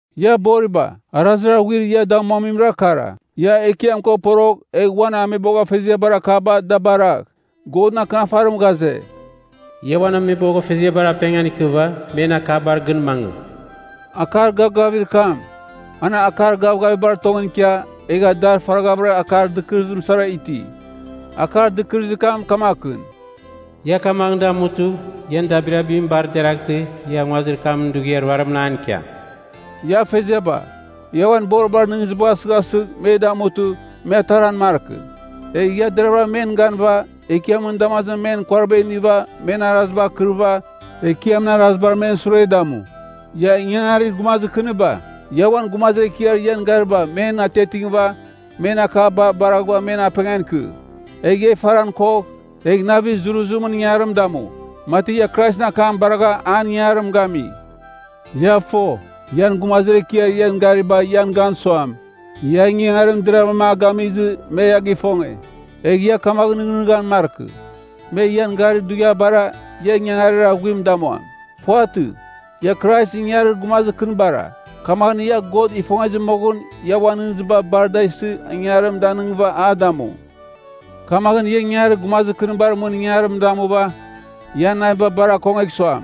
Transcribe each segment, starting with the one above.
Ia boriba, arazir aghuir ia damuamimra kara, ia Ekiam ko porogh egh uan ameboghfeziabar akaba da baragh. Godɨn Akɨnafarim ghaze, “Ia uan ameboghfeziabar apengan ikɨva men akabar gɨn mangɨ.” Akar gavgavir kam, an akar gavgavibar tongɨn ikia, egha dar faraghavɨra akar dɨkɨrɨzim sara iti. Akar dɨkɨrɨzir kam kamakɨn, “Ia kamaghɨn damutɨ, ian dabirabim bar deraghtɨ ia nguazir kam dughiar ruarimɨn an ikiam.” Ia afeziaba, ia uan boribar nɨghnɨzibagh asɨghasɨgh me damutɨ, me ataran markɨ. Egh ia deravɨra men ganɨva Ekiamɨn damazimɨn men kuariba iniva men araziba akɨrɨva, Ekiamɨn arazibar men sure damu. Ia ingangarir gumazir kɨniba, ia uan gumazir ekiar ian garibar men atiatingɨva, men akaba baraghɨva men apengan ikɨ. Egh ia ifaran kogh, egh navir zuruzimɨn ingangarim damu, mati ia Kraisɨn akam baragha an ingangarim gami. Ia fo, ian gumazir ekiar ian gariba ian gan suam, ia ingangarim deravɨram a gamizɨ me ia gifonge. Egha ia kamaghɨn nɨghnɨghan markɨ, me ian garir dughiabara, ia ingangarir aghuim damuam. Puvatɨ. Ia Kraisɨn ingangarir gumazir kɨnibara, kamaghɨn ia God ifongezɨ moghɨn ia uan nɨghnɨziba bar da isɨ ingangarim danɨngɨva a damu. Kamaghɨn ia ingangarir gumazir kɨnibar mɨn ingangarim damuva, ian naviba bar akongegh suam,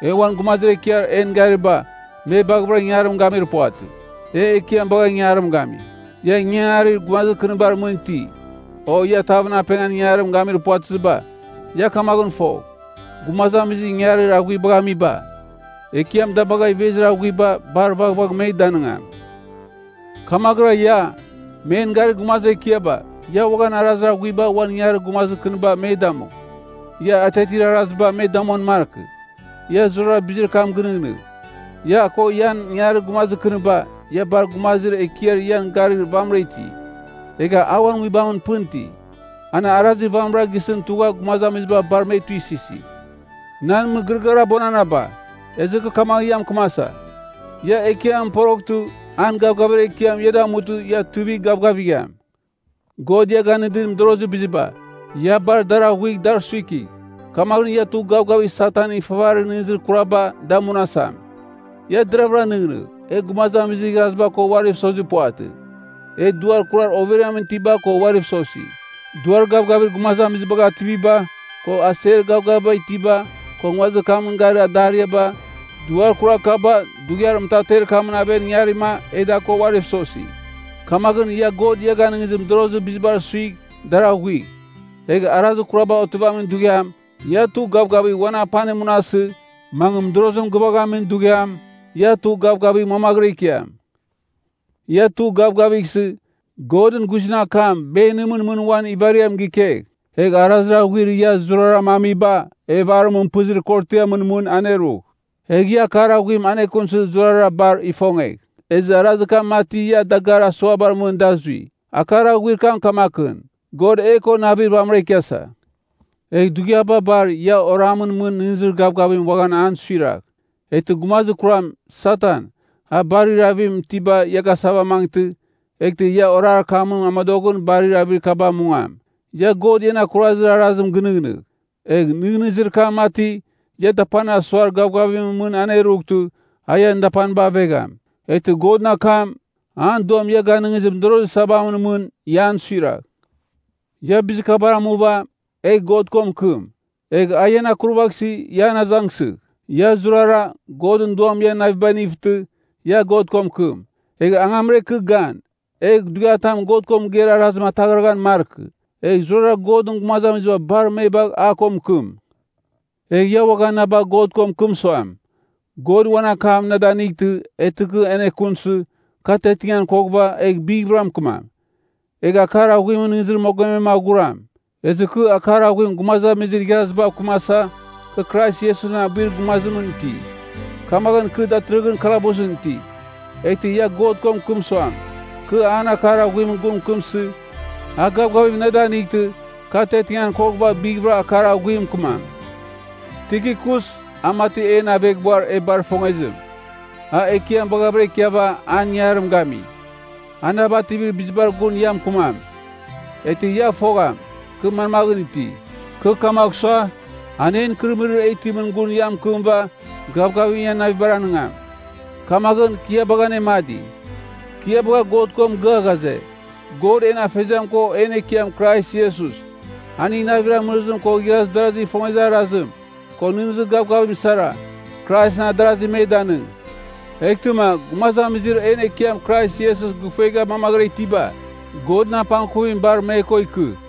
e uan gumazir ekiar en gariba me baghavɨra ingangarim gamir puvatɨ, e Ekiam bagha ingangarim gami. Ia ingangarir gumazir kɨnibar mɨn iti, o ia tavɨn apengan ingangarim gamir puvatɨziba, ia kamaghɨn fogh, gumazamizir ingangarir aghuibagh amiba, Ekiam da bagh ivezir aghuiba bar vaghvagh me danɨngam. Kamaghɨra ia, men garir gumazir ekiaba, ia uaghan arazir aghuiba uan ingangarir gumazir kɨniba me damu. Ia atiatir araziba me damuan markɨ. Ia zurara bizir kam gɨnɨghnɨgh, ia ko ian ingangarir gumazir kɨniba, ia bar Gumazir Ekiar Ian Garir vamɨra iti, egha a uan Nguibamɨn pɨn iti. An arazir vamɨra gisɨn tugha gumazamiziba bar me tuisɨsi. Nan mɨgɨrɨgɨar abuananaba, ezɨ kɨ kamaghɨn mɨkɨmasa, ia Ekiamɨn poroghtɨ an gavgavir ekiam ia damutɨ ia tuivigh gavgavigham. God ia ganɨdir mɨdorozir biziba, ia bar dar aghuigh dar suikigh. Kamaghɨn ia tugh gavgavigh Satanɨn ifavarir nɨghnɨzir kuraba da munasam. Ia deravɨra nɨghnɨgh, e gumazamizir igharaziba ko uariv sozir puvatɨ. E duar kurar overiamɨn itiba ko uariv sosi. Duar gavgavir gumazamizibagh ativiba, ko aser gavgaviba itiba, ko nguazir kamɨn garir adariaba, duar kurar kaba dughiar mɨtater kamɨn aven ingarima e da ko uariv sosi. Kamaghɨn ia God ia ganɨngizir mɨdorozir bizibar suigh dar aghuigh. Egh arazir kuraba otivamin dughiam, ia tugh gavgavigh uan apanim munasɨ, mangɨ mɨdorozim gɨvaghamin dughiam, ia tugh gavgavigh mamaghɨra ikiam. Ia tugh gavgavighsɨ, Godɨn guizɨn akam benimɨn mɨn uan ivariam gikegh. Egh arazir aghuir ia zuraram amiba evarimɨn pɨzir korotiamɨn mɨn anerugh. Egh ia Akar Aghuim anekunsɨ zurara bar ifongegh, ezɨ arazir kam mati ia dagarir asuabar mɨn da zui. Akar Aghuir kam kamakɨn, God e ko navir vamɨra ikiasa. Egh dughiaba bar ia oramɨn mɨn nɨghnɨzir gavgavim uaghan an suiragh, eghtɨ gumazir kuram, Satan, a barir avim itiba ia gasavamangɨtɨ, eghtɨ ia orar kamɨn amodoghɨn barir avir kaba mungam. Ia God ian akurazir arazim gɨnɨghnɨgh, egh nɨghnɨzir kam mati ia dapanir asuar gavgavimɨn mɨn anerughɨtɨ a ian dapaniba avegham. Eghtɨ Godɨn akam, an Duam ia ganɨngizir mɨdorozir sabamɨn mɨn ia an suiragh. Ia bizir kabar amuva, egh God ko mɨkɨm. Egh a ian akurvaghsɨ ia an azangsɨgh. Ia zurara, Godɨn Duam ian navibagh inivtɨ, ia God ko mɨkɨm. Egh angamra ikɨ gan, egh dughiatam God ko mɨgeir arazim ataghraghan markɨ, egh zurara Godɨn gumazamiziba bar me bagh a ko mɨkɨm. Egh ia uaghan na bagh God ko mɨkɨm suam, God uan akam na danightɨ, eghtɨ kɨ anekunsɨ, kɨ atiatingan koghɨva, egh bighvɨra mɨkɨmam. Egh Akar Aghuimɨn nɨghnɨzir mogomem aghuram. Ezɨ kɨ Akar Aghuim gumazamizir igharazibav kɨmasa, kɨ Krais Iesusɨn abuir gumazimɨn iti, kamaghɨn kɨ datɨrɨghɨn kalabusɨn iti. Eghtɨ ia God ko mɨkɨm suam, kɨ an Akar Aghuimɨn gun mɨkɨmsɨ, a gavgavim na danightɨ, kɨ atiatingan koghɨva bighvɨra Akar Aghuim mɨkɨmam. Tikikus, a mati en aveghbuar e bar ifongezim, a Ekiam baghavɨra ikiava an ingangarim gami. A na bativir bizibar gun ia mɨkɨmam. Eghtɨ ia fogham, kɨ manmaghɨn iti. Kɨ kamagh sua, an en ikɨrɨmɨrir e itimɨn gun ia mɨkɨmɨva gavgavim ian navibar anɨngam. Kamaghɨn, kɨ ia bagha anemadi. Kɨ ia bagha God ko mɨgɨa ghaze, God en Afeziam ko en Ekiam Krais Iesus, aning navir amɨrɨzim ko igharaz darazigh ifongezir arazim, ko nɨghnɨzir gavgavim sara, Kraisɨn adarazi me danɨng. Eghtɨma, gumazamizir en Ekiam Krais Iesus gɨfuegha mamaghɨra itiba, Godɨn apangkuvim bar me ko ikɨ.